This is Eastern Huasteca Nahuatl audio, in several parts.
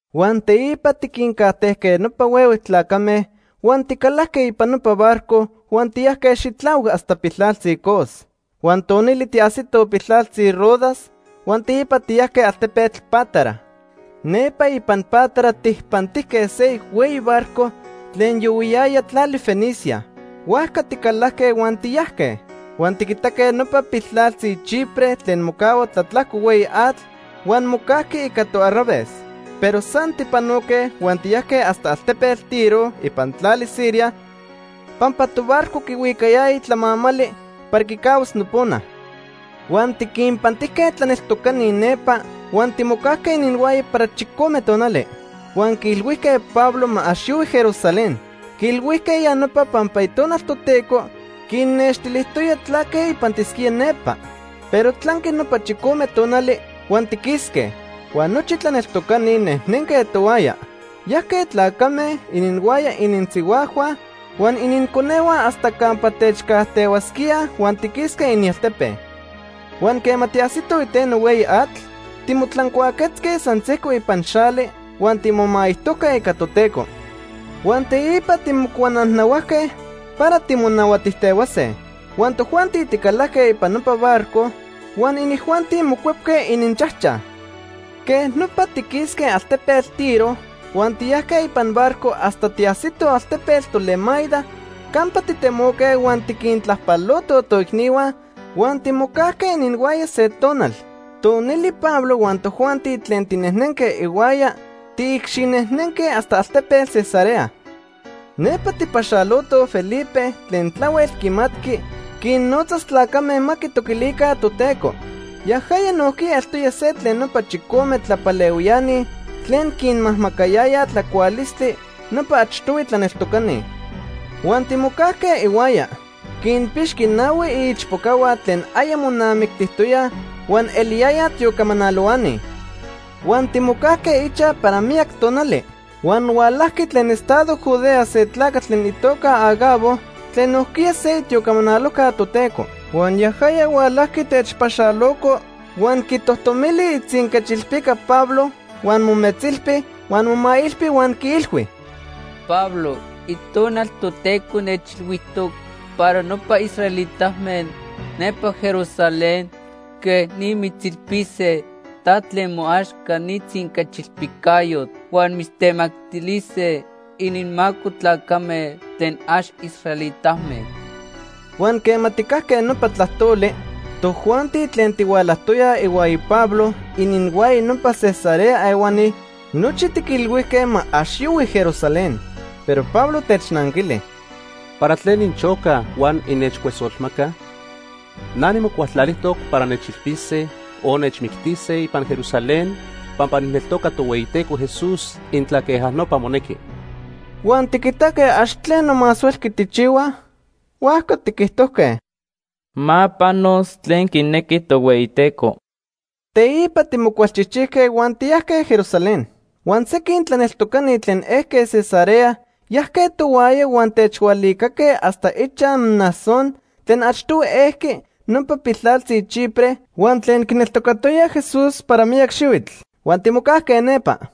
Huan teipa tiquincajtejque nopa huehue tlacame huan ticalajque ipan nopa barco huan tiyajque xitlahuac hasta piltlaltzi Cos. Huan tonili tiajsitoj piltlaltzi Rodas huan teipa tiyajque altepetl Pátara. Nepa ipan Pátara tijpantijque seyoc hueyi barco tlen yohuiyaya tlali Fenicia. Huajca ticalajque huan tiyajque. Huan tiquitaque nopa piltlaltzi Chipre tlen mocahua tlatlajco hueyi atl huan mocajqui ica toarraves. Pero san tijpanoque huan tiyajque hasta altepetl Tiro ipan tlali Siria pampa tobarco quihuicayaya tlamamali para quicahuas nopona. Huan tiquinpantijque tlaneltocani nepa huan timocajque ininhuaya para chicome tonali. Huan quiilhuijque Pablo ma ax yohui Jerusalén. Quiilhuijque ya nopa pampa Itonal Toteco quinnextilijtoya tlaque ipantisquía nepa. Pero tlanqui nopa chicome tonali huan tiquisque. Huan nochi tlaneltocani nejnenque tohuaya. Yajque tlacame, ininhuaya ininsihuajhua, huan ininconehua hasta campa techcajtehuasquíaj huan tiquisque inialtepe. Huan quema tiajsitoj iteno hueyi atl, timotlancuaquetzque san sejco ipan xali huan timomaijtojque ica Toteco. Huan teipa timocuanajnahuajque para timonahuatijtehuase. Huan tojuanti ticalajque ipan nopa barco huan inijuanti mocuepque ininchajchaj. Quej nopa tiquisque altepetl Tiro huan tiyajque ipan barco hasta tiajsitoj altepetl Tolemaida campa titemoque huan tiquintlajpalotoj toicnihua huan timocajque ininhuaya se tonal. Tonili Pablo huan tojuanti tlen tinejnenque ihuaya tiicxinejnenque hasta altepetl Cesarea. Nepa tijpaxalotoj Felipe tlen tlahuel quimatqui quinnotzas tlacame ma quitoquilica Toteco. Yajaya nojquiya eltoya se tlen nopa chicome tlapalehuiani tlen quinmajmacayayaj tlacualistli nopa achtohui tlaneltocani. Huan timocajque ihuaya. Quinpixqui nahui iichpocahua tlen aya monamictijtoyaj huan eliyayaj tiocamanalohuani. Huan timocajque ichaj para miyac tonali. Huan hualajqui tlen estado Judea se tlacatl tlen itoca Agabo tlen nojquiya se itiocamanalojca Toteco. Huan yajaya hualajqui techpaxaloco, huan quitojtomili itzinquechilpica Pablo huan mometzilpi huan momailpi huan quiilhui: ―Pablo, Itonal Toteco nechilhuijtoc para nopa israelitame nepa Jerusalén quej ni mitzilpise ta tlen moaxca ni tzinquechilpicayotl. Huan mitztemactilise ininmaco tlacame tlen ax israelitame. Huan quema tijcajque nopa tlajtoli, tojuanti tlen tihualajtoyaj ihuaya Pablo, ininhuaya nopa Cesarea ehuani, nochi tiquilhuijque ma ax yohui Jerusalén. Pero Pablo technanquili: ―¿Para tlen inchocaj huan innechcuesolmacaj? Na nimocualtlalijtoc para nechilpise o nechmictise ipan Jerusalén pampa nijneltoca Tohueyiteco Jesús intla queja nopa monequi. Huan tiquitaque ax tleno más huelqui tijchihuaj, huajca tiquijtojque: ―Ma panos tlen quinequi Tohueyiteco. Teipa timocualchijchijque huan tiyajque Jerusalén. Huan sequin tlaneltocani tlen ejque Cesarea yajque tohuaya huan techhualicaque hasta ichaj Mnasón tlen achtohui ejqui nopa piltlaltzi Chipre huan tlen quineltocatoya Jesús para miyac xihuitl. Huan timocajque nepa.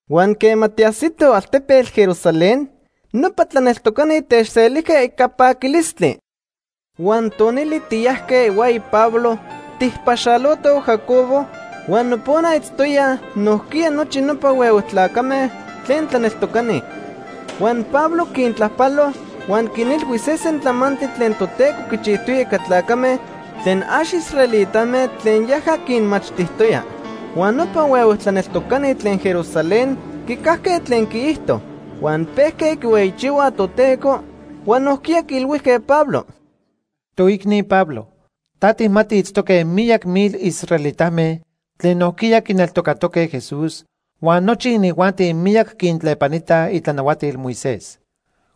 Huan quema tiajsitoj altepetl Jerusalén, nopa tlaneltocani techselijque ica paquilistli. Huan tonili tiyajque ihuaya Pablo tijpaxalotoj Jacobo, huan nopona itztoyaj nojquiya nochi nopa huehue tlacame tlen tlaneltocani. Huan Pablo quintlajpalo, huan quinilhui sesen tlamantli tlen Toteco quichijtoya ica tlacame tlen ax israelitame tlen yaja quinmachtijtoya. Huan nopa huehue tlaneltocani tlen Jerusalén quicajque tlen quiijto. Huan pejque quihueyichihuaj Toteco, huan nojquiya quiilhuijque Pablo: ―Toicni Pablo, ta tijmati itztoque miyac mil israelitame tlen nojquiya quineltocatoque Jesús, huan nochi inijuanti miyac quintlepanitaj itlanahuatil Moisés.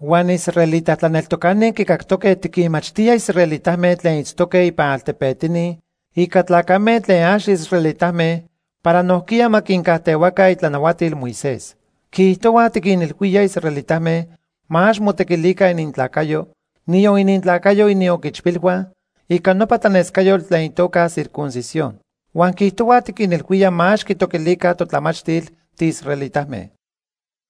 Huan israelita tlaneltocani quicactoque tiquinmachtía israelitame tlen itztoque ipan altepetini ica tlacame tlen ax israelitame para nojquiya ma quincajtehuaca itlanahuatil Moisés. Quiijtohuaj tiquinilhuía israelitame ma ax motequilica inintlacayo, niyon inintlacayo inioquichpilhua, ica nopa tlanescayotl tlen itoca circuncisión. Huan quiijtohuaj tiquinilhuía ma ax quitoquilica totlamachtil tiisraelitame.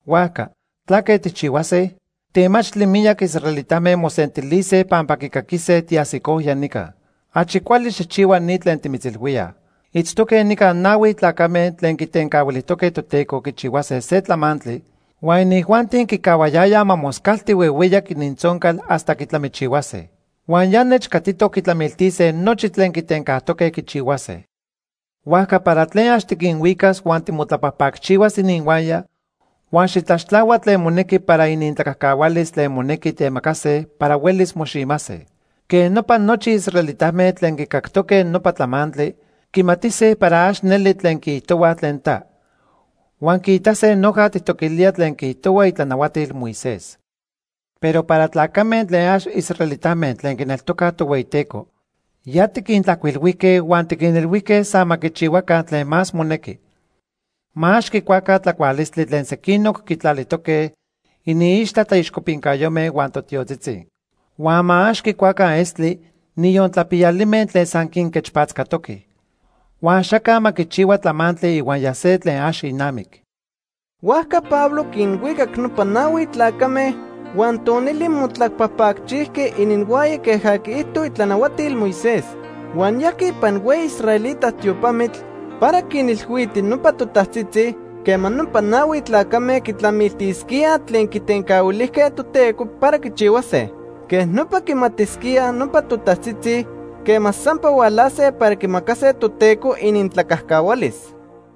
Huajca ¿tlaque tijchihuase? Temachtli miyac israelitame mosentilise pampa quicaquise tiajsicoya nica. Achi cuali xijchihua ni tlen timitzilhuíaj. Itztoque nica nahui tlacame tlen quitencahuilijtoque Toteco quichihuase se tlamantli huan inijuanti quicahuayayaj ma moscalti huehueyac inintzoncal hasta quitlamichihuase. Huan ya nechcatitoc quitlamiltise nochi tlen quitencajtoque quichihuase. Huajca para tlen ax tiquinhuicas huan timotlapajpacchihuas ininhuaya huan xitlaxtlahua tlen monequi para inintlacajcahualis tlen monequi temacase para huelis moximase. Quej nopa nochi israelitame tlen quicactoque nopa tlamantli, quimatise para ax neli tlen quiijtohuaj tlen ta. Huan quiitase noja tijtoquilía tlen quiijtohua itlanahuatil Moisés. Pero para tlacame tlen ax israelitame tlen quineltocaj Tohueyiteco, ya tiquintlajcuilhuijque huan tiquinilhuijque san ma quichihuaca tlen más monequi. Ma ax quicuaca tlacualistli tlen sequinoc quitlalijtoque iniixtla tlaixcopincayome huan totiotzitzi. Huan ma ax quicuaca estli, niyon tlapiyalime tlen san quinquechpatzcatoque. Huan axaca ma quichihua tlamantli ihuaya se tlen ax inamic. Huajca Pablo quinhuicac nopa nahui tlacame huan tonili motlapajpacchijqui ininhuaya queja quiijto itlanahuatil Moisés. Huan yajqui ipan hueyi israelita tiopamitl para quinilhuiti nopa totajtzitzi quema nopa nahui tlacame quitlamiltisquíaj tlen quitencahuilijque Toteco para quichihuase. Quej nopa quimatisquíaj nopa totajtzitzi quema sampa hualase para quimacase Toteco inintlacajcahualis.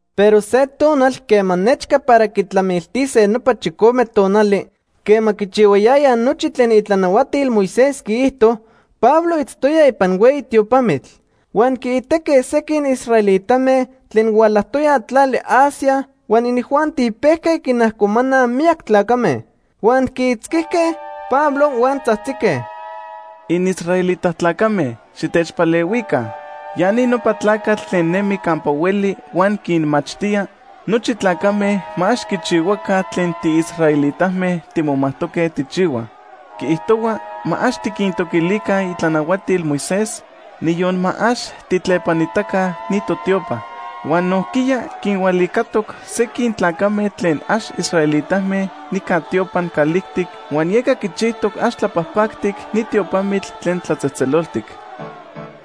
Pero se tonal quema nechca para quitlamiltise nopa chicome tonali quema quichihuayayaj nochi tlen itlanahuatil Moisés quiijto, Pablo itztoya ipan hueyi tiopamitl. Huan quiitaque sequin israelitame tlen hualajtoyaj tlali Asia huan inijuanti pejque quinajcomanaj miyac tlacame. Huan quiitzquijque Pablo, huan tzajtzique: “Inisraelita tlacame, xitechpalehuica. Ya ni nopa tlacatl tlen nemi campa hueli huan quinmachtía nochi tlacame ma ax quichihuaca tlen tiisraelitame timomajtoque tijchihuaj. Quiijtohua ma ax tiquintoquilica itlanahuatil Moisés, niyon ma ax tijtlepanitaca ni totiopa. Huan nojquiya quinhualicatoc sequin tlacame tlen ax israelitame nica tiopan calijtic huan yeca quichijtoc ax tlapajpactic ni tiopamitl tlen tlatzejtzeloltic.”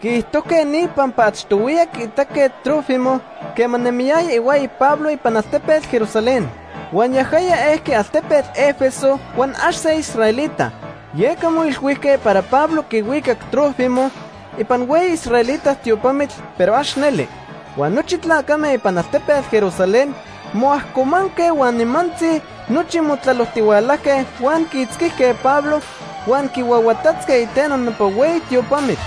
Quiijtojque ni pampa achtohuiya quiitaque Trófimo quema nemiyaya ihuaya Pablo ipan altepetl Jerusalén. Huan yajaya ejqui altepetl Éfeso huan ax se israelita. Yeca moilhuijque para Pablo quihuicac Trófimo ipan hueyi israelita tiopamitl, pero ax neli. Huan nochi tlacame ipan altepetl Jerusalén moajcomanque huan nimantzi nochi motlalojtihualajque huan quiitzquijque Pablo huan quihuahuatatzque iteno nopa hueyi tiopamitl.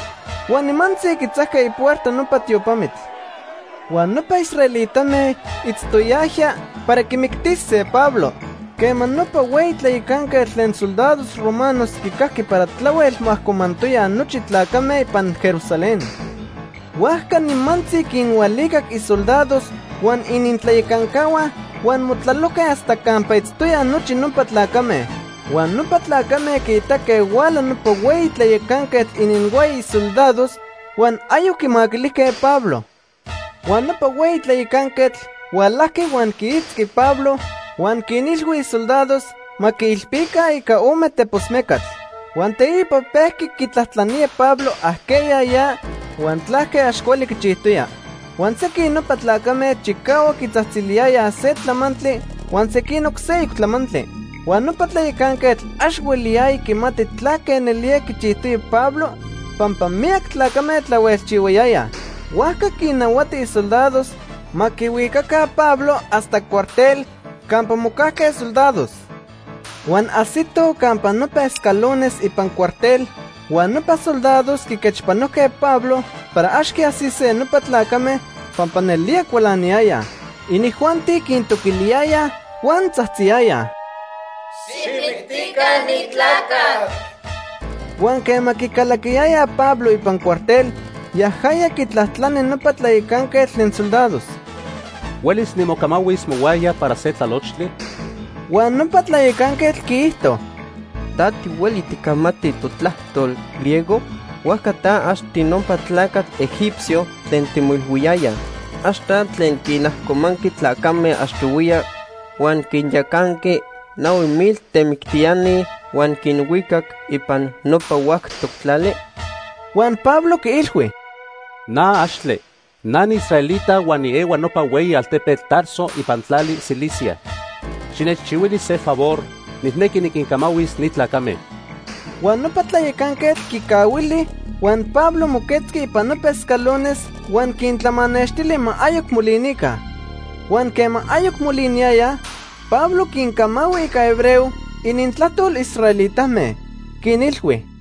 Huan nimantzi quitzajque ipuerta nopa tiopamitl. Huan nopa israelitame itztoyajya para quimictise Pablo quema nopa hueyi tlayacanquetl tlen soldados romanos quicajqui para tlahuel moajcomantoyaj nochi tlacame ipan Jerusalén. Huajca nimantzi quinhualicac isoldados huan inintlayacancahua huan motlalojque hasta campa itztoyaj nochi nopa tlacame. Huan nopa tlacame quiitaque huala nopa hueyi tlayacanquetl ininhuaya isoldados huan ayoc quimaquilijque Pablo. Huan nopa hueyi tlayacanquetl hualajqui huan quiitzqui Pablo huan quinilhui isoldados ma quiilpica ica ome tepos mecatl. Huan teipa pejqui quitlajtlanía Pablo ajqueya ya huan tlaque ax cuali quichijtoya. Huan sequin nopa tlacame chicahuac quitzajtziliyayaj se tlamantli huan sequinoc seyoc tlamantli. Huan nopa tlayacanquetl ax hueliyaya quimati tlaque nelía quichijtoya Pablo pampa miyac tlacame tlahuelchihuayayaj. Huajca quinnahuati isoldados ma quihuicaca Pablo hasta cuartel campa mocajque soldados. Huan ajsitoj campa nopa escalones ipan cuartel, huan nopa soldados quiquechpanojque Pablo para ax quiajsise nopa tlacame pampa nelía cualaniyayaj. Inijuanti quintoquiliyayaj huan tzajtziyayaj: “¡Xijmictica ni tlacatl!” Huan quema quicalaquiyayaj Pablo ipan cuartel, yajaya quitlajtlani nopa tlayacanquetl tlen soldados: ―¿Huelis nimocamahuis mohuaya para se tlalochtli? Huan nopa tlayacanquetl quiijto: ―¿Ta tihueli ticamati totlajtol, griego? Huajca ta ax tinopa tlacatl egipcio tlen timoilhuiyayaj. ¿Ax ta tlen quinajcomanqui tlacame achtohuiya, huan quinyacanqui nahui mil temictiani huan quinhuicac ipan nopa huactoc tlali? Huan Pablo quiilhui: ―Na axtle. Na niisraelita huan niehua nopa hueyi altepetl Tarso ipan tlali Cilicia. Xinechchihuili se favor, nijnequi niquincamahuis ni tlacame. Huan nopa tlayacanquetl quicahuili, huan Pablo moquetzqui ipan nopa escalones huan quintlamanextili ma ayoc molinica. Huan quema ayoc moliniyayaj, Pablo quincamahui ica hebreo, inintlajtol israelitame. Quinilhui: